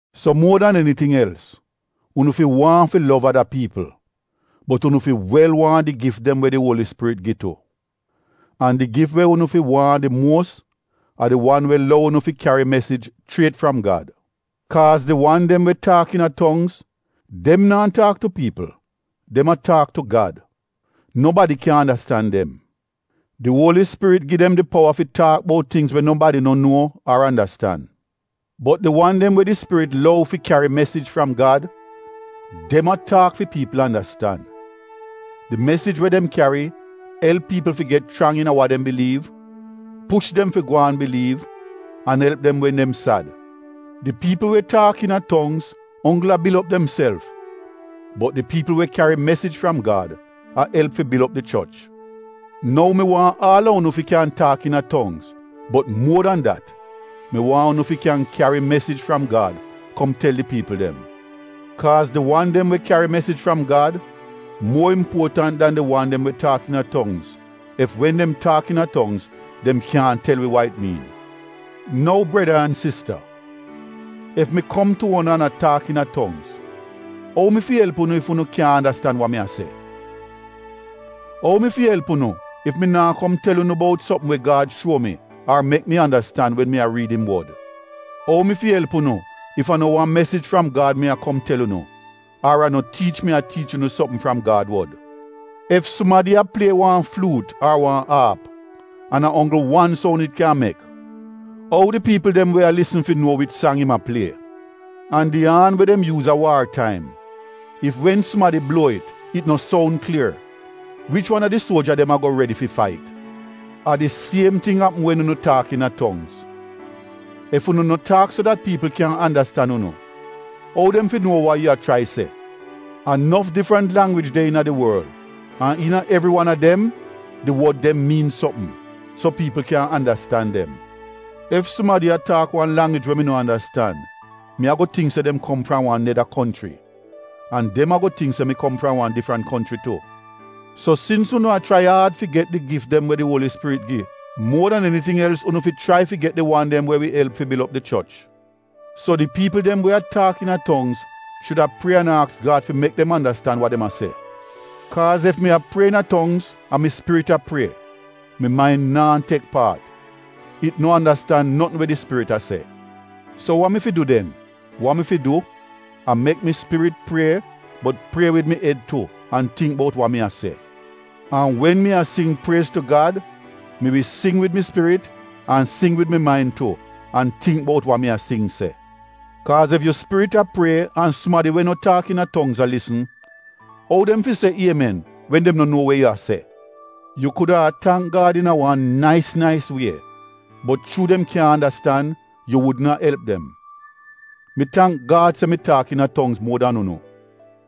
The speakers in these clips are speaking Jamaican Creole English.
So muo dan eniting els, unu fi waahn fi lov ada piipl, bot unu fi wel waahn di gif dem we di Uoli Spirit gi tu. An di gif we unu fi waahn di muos a di wan we lou unu fi kyari mesij chriet fram Gad. Kaaz di wan dem we taak iina tongz, dem naa taak tu piipl dem a taak tu Gad; nobadi kyan andastan dem. Di Uoli Spirit gi dem di powa fi taak bout tingz we nobadi no nuo ar andastan. Bot di wan dem we di Spirit lou fi kyari mesij fram Gad, dem a taak fi piipl andastan. Di mesij we dem kyari elp piipl fi get chrang iina wa dem biliiv, push dem fi gwaan biliiv an elp dem wen dem sad. Di piipl we taak iina tongz onggl a bil op demself bot di piipl we kyari mesij fram Gad a elp fi bil op di choch. Nou mi waahn aal a unu fi kyan taak iina tongz bot muo dan dat mi waahn unu fi kyan kyari mesij fram Gad kom tel di piipl dem. Kaaz di wan dem we kyari mesij fram Gad muo impuotant dan di wan dem we taak iina tongz, ef wen dem taak iina tongz dem kyaahn tel wi wa it miin. Nou breda an sista, ef mi kom tu unu an a taak iina tongz ou mi fi elp unu ef unu kyaahn andastan wa mi a se? Ou mi fi elp unu ef mi naa kom tel unu bout sopm we Gad shuo mi ar mek mi andastan wen mi a riid im Wod? Ou mi fi elp unu ef a no wan mesij fram Gad mi a kom tel unu ar a no tiich mi a tiich unu sopm fram Gad wod? Ef sumadi a plie wan fluut ar wan aap an a onggl wan soun it kyan mek, ou di piipl dem we a lisn fi nuo wich sang im a plie? An di aan we dem yuuz a waar taim, ef wen sumadi bluo it, it no soun klier, wich wan a di suoja dem ago redi fi fait? A di siem ting apm wen unu taak iina tongz! Ef unu no taak so dat piipl kyan andastan unu, ou dem fi nuo wa yu a chrai se? A nof difrant langwij de iina di worl an iina evri wan a dem, di wod dem miin sopm, so piipl kyan andastan dem. Ef sumadi a taak wan langwij we mi no andastan mi ago tingk se dem kom fram wan neda konchri. An dem ago tingk se mi kom fram wan difrant konchri tu. So sins unu a chrai aad fi get di gif dem we di Uoli Spirit gi, muo dan eniting els unu fi chrai fi get di wan dem we wi elp fi bil op di choch. So di piipl dem we a taak iina tongz shuda prie an aks Gad fi mek dem andastan wa dem a se. Kaaz ef mi a prie iina tongz, a mi spirit a prie. Mi main naa tek paat, it no andastan notn we di spirit a se. So wa mi fi du den? Wa mi fi du a mek mi spirit prie bot prie wid mi ed tu an tingk bout wa mi a se. An wen mi a sing priez tu Gad, mi wi sing wid mi spirit an sing wid mi main tu an tingk bout wa mi a sing se. Kaaz ef yu spirit a prie an sumadi we no taak iina tongz a lisn, ou dem fi se ‘Iemen’ wen dem no nuo we yu a se? Yu kuda a tangk Gad iina wan nais nais wie bot chuu dem kyaahn andastan, yu wudn a elp dem. Mi tangk Gad se mi taak iina tongz muo dan unu.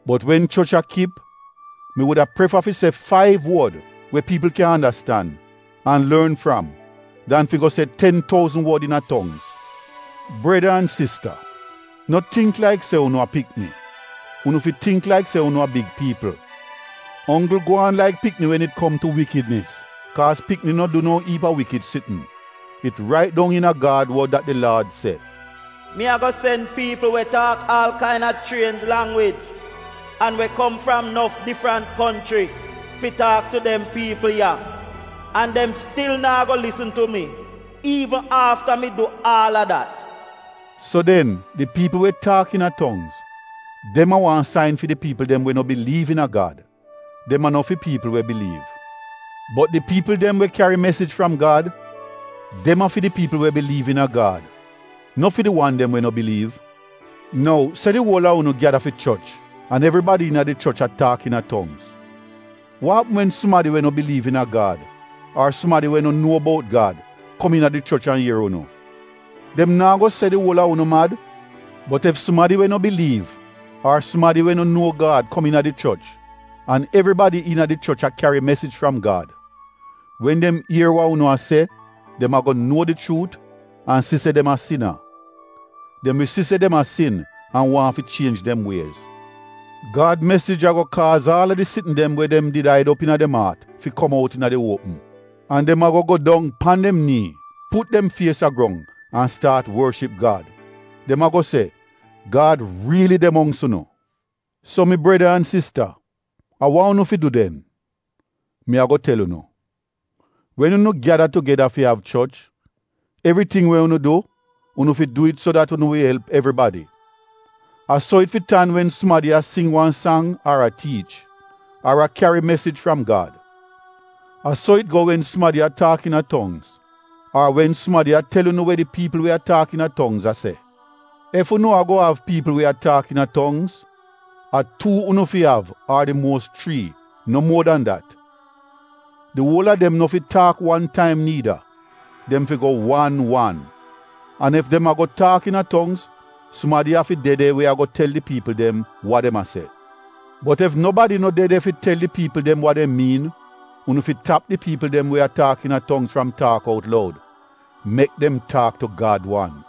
Bot wen choch a kip mi wuda prefa fi se faiv wod we piipl kyan andastan an lorn fram dan fi go se ten touzn wod iina tongz. Breda an sista no tingk laik se unu a pikni, unu fi tingk laik se unu a big piipl. Onggl gwaan laik pikni wen it kom tu iivl sitn kaaz pikni no du no iip a wikid sitn. It rait dong iina Gad wod dat di Laad se: “Mi ago sen piipl we taak aal kaina chrienj langwij an we kom fram nof difrant konchri fi taak tu dem piipl ya, an dem stil naa go lisn tu mi iivn afta mi du aal a dat.” So den di piipl we taak iina tongz, dem a wan sain fi di piipl dem we no biliiv iina Gad, dem a no fi piipl we biliiv. Bot di piipl dem we kyari mesij fram Gad, dem a fi di piipl we biliiv iina Gad, no fi di wan dem we no biliiv. Nou se di uol a unu gyada fi choch an evribadi iina di choch a taak iina tongz, wa apm wen sumadi we no biliiv iina Gad ar sumadi we no nuo bout Gad kom iina di choch an ier unu? Dem naa go se di uol a unu mad? Bot ef sumadi we no biliiv ar sumadi we no nuo Gad kom iina di choch an evribadi iina di choch a kyari mesij fram Gad, wen dem ier wa unu a se dem ago nuo di chuut an si se dem a sina. Dem wi si se dem a sin an waahn fi chienj dem wiez. Gad mesij ago kaaz aal a di sitn dem we dem did aid op iina dem aat fi kom out iina di uopm, an dem ago go dong pan dem nii, put dem fies a grong an staat worship Gad. Dem ago se, “Gad riili de mongks unu.” So mi breda an sista, a wa unu fi du den? Mi ago tel unu! Wen unu gyada tugeda fi av choch, evriting we unu du, unu fi du it so dat unu wi elp evribadi. A so it fi tan wen sumadi a sing wan sang ar a tiich, ar a kyari mesij fram Gad. A so it go wen sumadi a taak iina tongz ar wen sumadi a tel unu we di piipl we a taak iina tongz a se. Ef unu ago av piipl we a taak iina tongz, a tuu unu fi av ar di muos chrii, no muo dan dat. Di uol a dem no fi taak wan taim niida, dem fi go wan wan. An ef dem ago taak iina tongz sumadi afi de de we ago tel di piipl dem wa dem a se. Bot ef nobadi no de de fi tel di piipl dem wa dem miin, unu fi tap di piipl dem we a taak iina tongz fram taak out loud, mek dem taak tu Gad wan.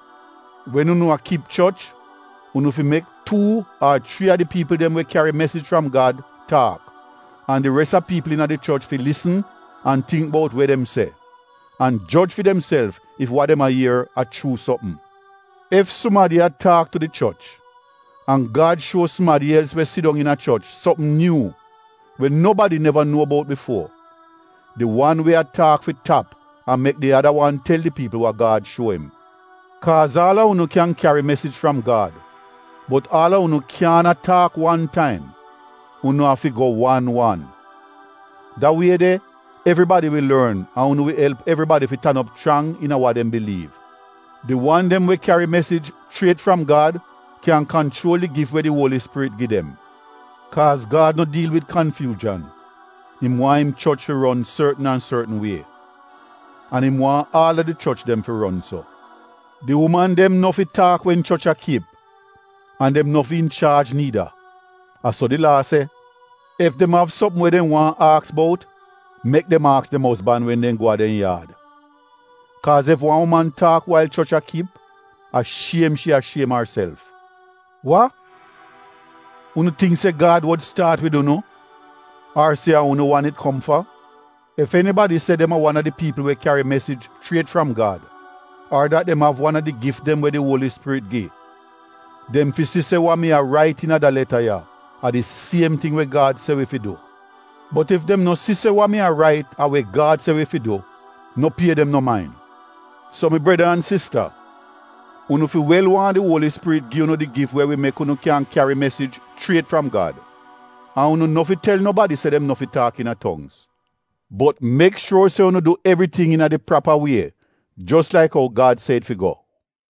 Wen unu a kip choch, unu fi mek tuu ar chrii a di piipl dem we kyari mesij fram Gad taak. An di res a piipl iina di choch fi lisn an tingk bout we dem se, an joj fi demself ef wa dem a ier a chuu sopm. Ef sumadi a taak tu di choch, an Gad shuo sumadi els we sidong iina choch sopm nyuu, we nobadi neva nuo bout bifuo, di wan we a taak fi tap an mek di ada wan tel di piipl wa Gad shuo im. Kaaz aal a unu kyan kyari mesij fram Gad, bot aal unu kyaahn a taak wan taim, unu a fi go wan wan. Da wie de evribadi wi lorn an unu wi elp evribadi fi tan op chrang iina wa dem biliiv. Di wan dem we kyari mesij chriet fram Gad kyan kanchuol di gif we di Uoli Spirit gi dem. Kaaz Gad no diil wid kanfyuuzhan, im waahn im choch fi ron sortn an sortn wie. An im waahn aal a di choch dem fi ron so. Di uman dem no fi taak wen choch a kip, an dem no fi inchaaj niida, a so di Laa se. Ef dem av sopm we dem waahn aks bout, mek dem aks dem ozban wen dem go a dem yaad. Kaaz ef wan uman taak wail choch a kip a shiem shi a shiem arself. Wa! Unu tingk se Gad wod staat wid unu ar se a unu wan it kom fa? Ef enibadi se dem a wan a di piipl we kyari mesij chriet fram Gad ar dat dem av wan a di gif dem we di Uoli Spirit gi, dem fi si se wa mi a rait iina de leta ya, a di siem ting we Gad se wi fi du. Bot ef dem no si se wa mi a rait a we Gad se wi fi du, no pie dem no main. So mi breda an sista, unu fi wel waahn di Uoli Spirit gi unu di gif we wi mek unu kyan kyari mesij chriet fram Gad. An unu no fi tel nobadi se dem no fi taak iina tongz, bot mek shuor se unu du evriting iina di prapa wie jos laik ou Gad se it fi go.